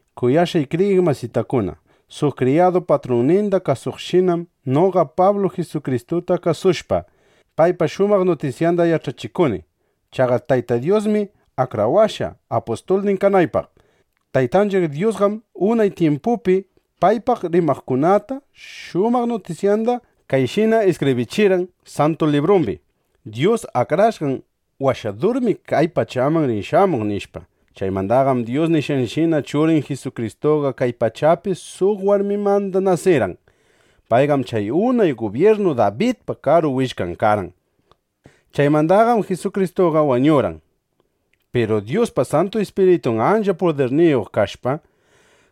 Kuyashqay kriyiq masitakuna, suq kriyadu patrunninda kasuqshinam noqa Pablu Jisukristuta kasushpa, paypa shumaq nutisyanda yach'achikuni. Chaqa Tayta Dyusmi akrawashqa, apustulnin kanaypaq. Taytanchiq Dyusqam unay tyimpupi paypaq rimaqkunata shumaq nutisyanda kayshina iskibrichirqan Santu Librumbi: Dyus Akrashqan Washadurmi kay pachaman rin shamuq, nishpa. Chaymandaqam Dyus nishqanshina, Churin Jisukristuqa kay pachapi suq warmimanda nasirqan. Payqam chay unay gubyirnu Dabidpa karu willkan karqan. Chaymandaqam Jisukristuqa wañurqan. Piru Dyuspa Santu Ispiritun ancha pudirniyuq kashpa,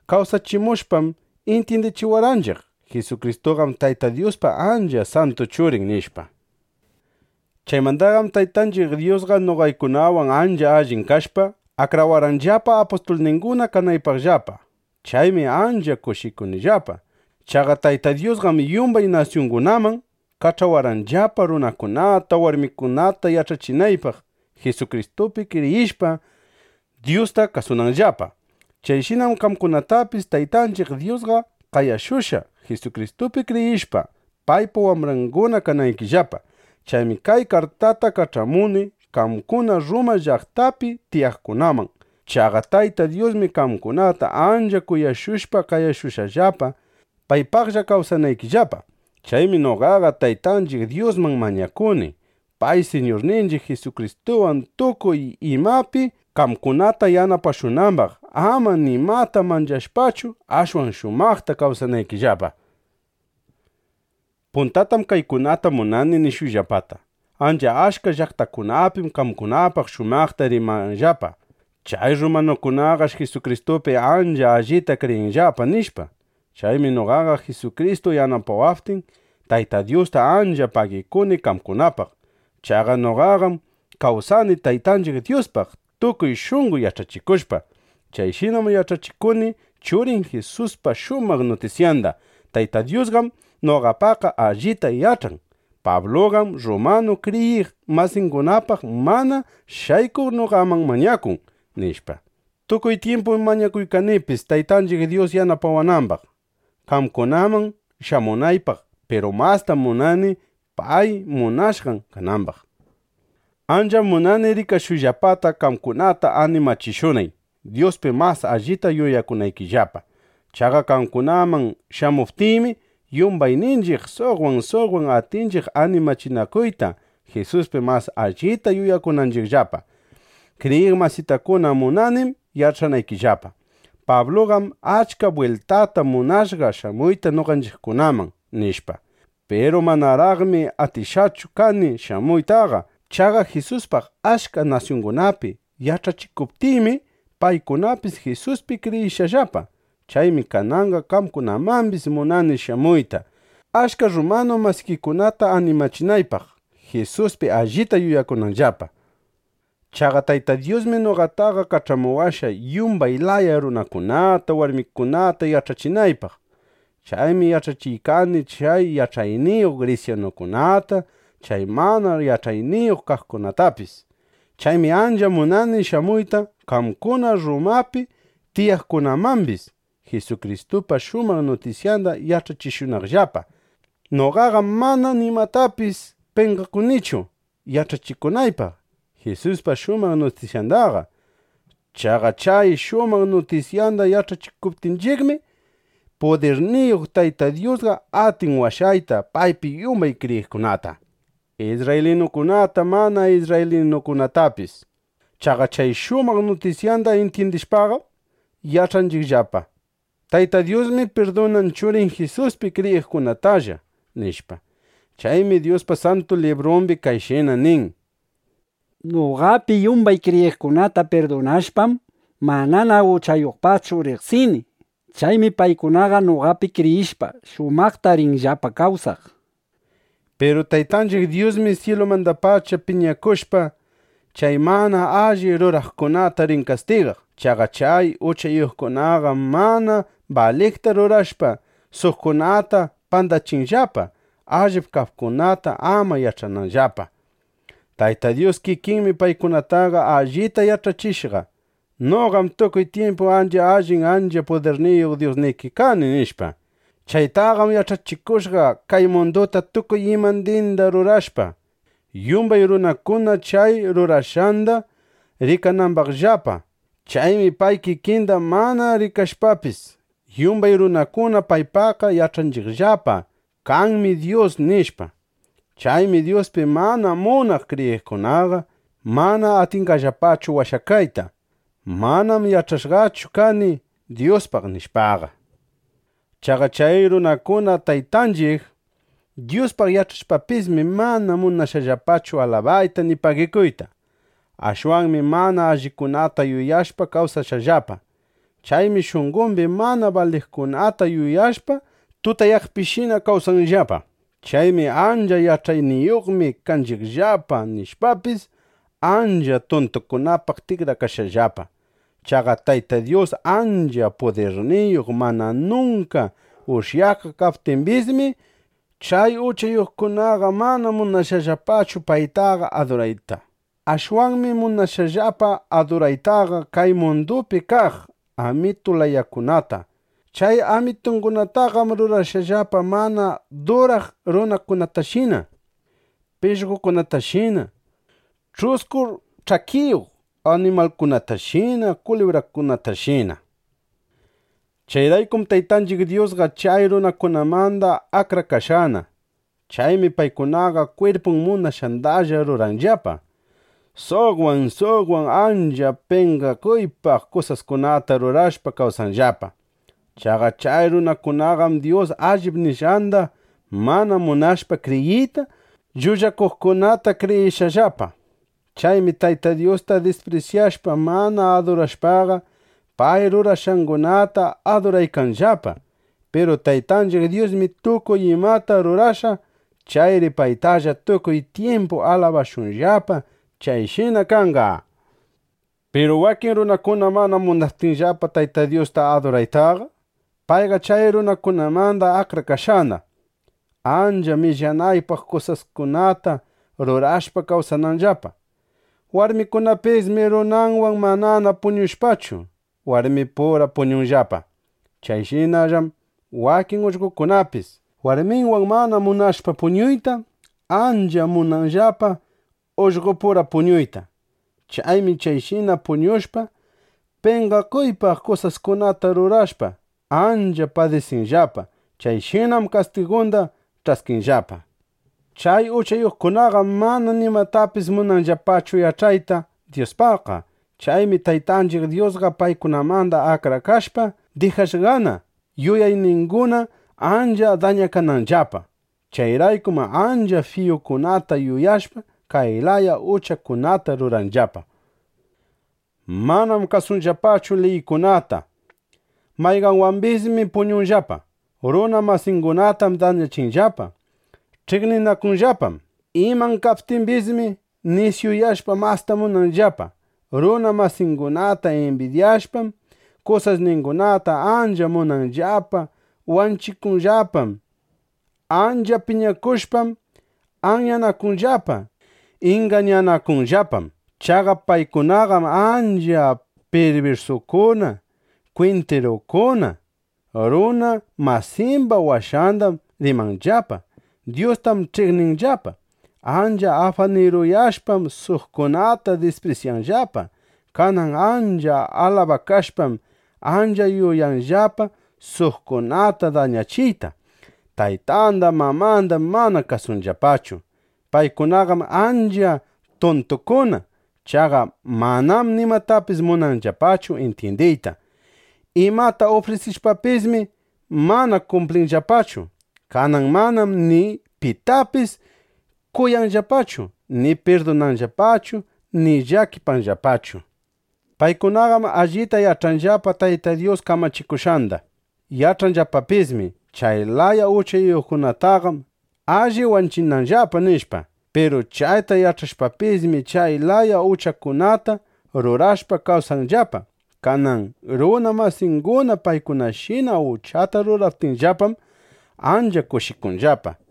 kawsachimushpam, intyindichiwarqanchiq: Jisukristuqam Tayta Dyuspa ancha santu Churin, nishpa. Chaymandaqam Taytanchiq Dyusqa noqaykunawan ancha allin kashpa, akrawarqanllapa, apustulninguna kanaypaqllapa. Chaymi ancha kushikunillapa. Chaqa Tayta Dyusqam yumbay nasyungunaman kach'awarqanllapa, runakunata, warmikunata yach'achinaypaq, Jisukristupi kriyishpa, Dyusta kasunanllapa. Chayshinam qamkunatapis Taytanchiq Dyusqa qayashushqa, Jisukristupi kriyishpa, paypa wambranguna kanaykillapa. Chaymi kay kartata kach'amuni qamkuna Rruma llaqtapi tiyaqkunaman. Chaqa Tayta Dyusmi qamkunata ancha kuyashushpa, qayashushqallapa, paypaqlla kawsanaykillapa. Chaymi noqaqa Taytanchiq Dyusman mañakuni, pay, Siñurninchiq Jisukristuwan, tukuy imapi qamkunata yanapashunambaq, ama nimata manchashpachu, ashwan shumaqta kawsanaykillapa. Puntatam kaykunata munani nishuyllapata: Ancha achka llaqtakunapim qamkunapaq shumaqta rimanllapa: Chay rrumanukunaqash Jisukristupi ancha allita kriyinllapa, nishpa. Chaymi noqaqa Jisukristu yanapawaptin, Tayta Dyusta ancha pagikuni qamkunapaq. Chaqa noqaqam kawsani Taytanchiq Dyuspaq tukuy shunqo yach'achikushpa. Chayshinam yach'achikuni Churin Jisuspa shumaq nutisyanda. Tayta Dyusqam noqapaqqa allita yach'an: Pabluqam rrumanu kriyiq masingunapaq mana shaykuq noqaman mañakun, nishpa. Tukuy tyimpum mañakuykanipis, Taytanchiq Dyus yanapawanambaq, qamkunaman shamunaypaq. Piru mastam munani pay munashqan kanambaq. Ancham munani rikashuyllapata, qamkunata animachishunay, Dyuspi mas allita yuyakunaykillapa. Chaqa qamkunaman shamuptiymi, yumbayninchiq suqwan, suqwan atinchiq animachinakuyta, Jisuspi mas allita yuyakunanchiqllapa. Kriyiq masitakuna, munanim yach'anaykillapa: Pabluqam achka bwiltata munashqa shamuyta noqanchiqkunaman, nishpa. Piru manaraqmi atishqachu kani shamuytaqa. Chaqa Jisuspaq achka nasyungunapi yach'achikuptiymi, paykunapis Jisuspi kriyishqallapa. Chaymi kananqa qamkunamambis munani shamuyta, achka rrumanu masikikunata animachinaypaq, Jisuspi allita yuyakunanllapa. Chaqa Tayta Dyusmi noqataqa kach'amuwashqa, yumbay laya runakunata, warmikunata yach'achinaypaq. Chaymi yach'achiykani chay yach'ayniyuq grisyanukunata, chay mana yach'ayniyuq kaqkunatapis. Chaymi ancha munani shamuyta qamkuna Rrumapi tiyaqkunamambis, Jisukristupa shumaq nutisyanda yach'achishunayllapa. Noqaqam mana nimatapis penqakunichu yach'achikunaypaq Jisuspa shumaq nutisyandaqa. Chaqa chay shumaq nutisyanda yach'achikuptinchiqmi, pudirniyuq Tayta Dyusqa atin washayta paypi yumbay kriyiqkunata, isrraylinukunata, mana isrraylinu kaqkunatapis. Chaqa chay shumaq nutisyanda intyindishpaqam, yach'anchiqllapa: Tayta Dyusmi pirdunan Churin Jisuspi kriyiqkunatalla, nishpa. Chaymi Dyuspa Santu Librumbi kayshina nin: “Noqapi yumbay kriyiqkunata pirdunashpam, manana uchayuqpaqchu riqsini. Chaymi paykunaqa, noqapi kriyishpa, shumaqta rinllapa kawsaq”, nishpa. Piru Taytanchiq Dyusmi syilumandapacha piñakushpa, chay mana alli ruraqkunata rin kastigaq. Chaqa chay uchayuqkunaqam mana baliqta rurashpa, suqkunata pandachinllapa, allip kaqkunata ama yach'ananllapa. Tayta Dyus kikinmi paykunataqa allita yach'achishqa: “Noqam tukuy tyimpu ancha allin, ancha pudirniyuq Dyusniki kani”, nishpa. Chaytaqam yach'achikushqa, kay munduta tukuy imandinda rurashpa, yumbay runakuna chay rurashqanda rikanambaqllapa. Chaymi pay kikinda mana rikashpapis, yumbay runakuna paypaqqa yach'anchiqllapa: Kanmi Dyus, nishpa. Chaymi Dyuspi mana munaq kriyiqkunaqa mana atinqallapachu washakayta: Manam yach'ashqachu kani Dyuspaq, nishpaqa. Chaqa chay runakuna Taytanchiq Dyuspaq yach'ashpapismi, mana munashqallapachu alabayta ni pagikuyta. Ashwanmi mana allikunata yuyashpa kawsashqallapa. Chaymi shunqombi mana baliqkunata yuyashpa, tutayaqpishina kawsanllapa. Chaymi: Ancha yach'ayniyuqmi kanchiqllapa, nishpapis, ancha tuntukunapaq tikrakashqallapa. Chaqa Tayta Dyus ancha pudirniyuq, mana nunka ushyakaq kaptimbismi, chay uchayuqkunaqa mana munashqallapachu paytaqa adurayta. Ashwanmi munashqallapa aduraytaqa kay mundupi kaq amitu layakunata. Chay amitungunataqam rurashqallapa mana duraq runakunatashina, pishqokunatashina, ch'usku ch'akiyuq animalkunatashina, kulibrakunatashina. Chayraykum Taytanchiq Dyusqa chay runakunamanda akrakashqana. Chaymi paykunaqa kwirpun munashqandalla ruranllapa. Suqwan suqwan ancha penqakuypaq kusaskunata rurashpa kawsanllapa. Chaqa chay runakunaqam Dyus allip nishqanda mana munashpa kriyiyta, llullakuqkunata kriyishqallapa. Chaymi Tayta Dyusta disprisyashpa, mana adurashpaqa, pay rurashqangunata aduraykanllapa. Piru Taytanchiq Dyusmi tukuy imata rurashqa. Chayri paytalla tukuy tyimpu alabashunllapa. ¡Chayshina kanqa! Piru wakin runakuna mana munaptinllapa Tayta Dyusta aduraytaqa, payqa chay runakunamanda akrakashqana, ancha millanaypaq kusaskunata rurashpa kawsananllapa. Warmikunapismi runanwan mana puñushpachu, warmipura puñunllapa. Chayshinallam wakin ullqokunapis warminwan mana munashpa puñuyta, ancha munanllapa ullqopura puñuyta. Chaymi chayshina puñushpa, penqakuypaq kusaskunata rurashpa, ancha padisinllapa. Chayshinam kastigunda ch'askinllapa. Chay uchayuqkunaqam mana nimatapis munanllapachu yach'ayta Dyuspaqqa. Chaymi Taytanchiq Dyusqa paykunamanda akrakashpa, dijashqana yuyayninguna ancha dañakananllapa. Chayraykum ancha fiyukunata yuyashpa, kay laya uchakunata ruranllapa: Manam kasunllapachu liykunata; mayqanwambismi puñunllapa; runa masingunatam dañachinllapa; ch'iqninakunllapam. Iman kaptimbismi, nisyuyashpa, masta munanllapa; runa masingunata imbidyashpam, kusasningunata ancha munanllapa; wanchikunllapam. Ancha piñakushpam, anyanakunllapa; ingañanakunllapam. Chaqa paykunaqam ancha pirbirsukuna, kwintirukuna. Runa masimba washandam rimanllapa. Dyustam ch'iqninllapa. Ancha afaniruyashpam, suqkunata disprisyanllapa. Kanan ancha alabakashpam, ancha yuyanllapa suqkunata dañachiyta. Taytanda mamandam mana kasunllapachu. Paykunaqam ancha tuntukuna. Chaqa manam nimatapis munanllapachu intyindiyta. Imata ufrisishpapismi, mana kumplinllapachu. Kanan manam ni pitapis kuyanllapachu ni pirdunanllapachu ni llakipanllapachu. Paykunaqam allita yach'anllapa Tayta Dyus kamachikushqanda. Yach'anllapapismi: Chay laya uchayuqkunataqam, alli wanchinanllapa, nishpa. Piru chayta yach'ashpapismi, chay laya uchakunata rurashpa kawsanllapa. Kanan runa masinguna paykunashina uchata ruraptinllapam, ancha kushikunllapa.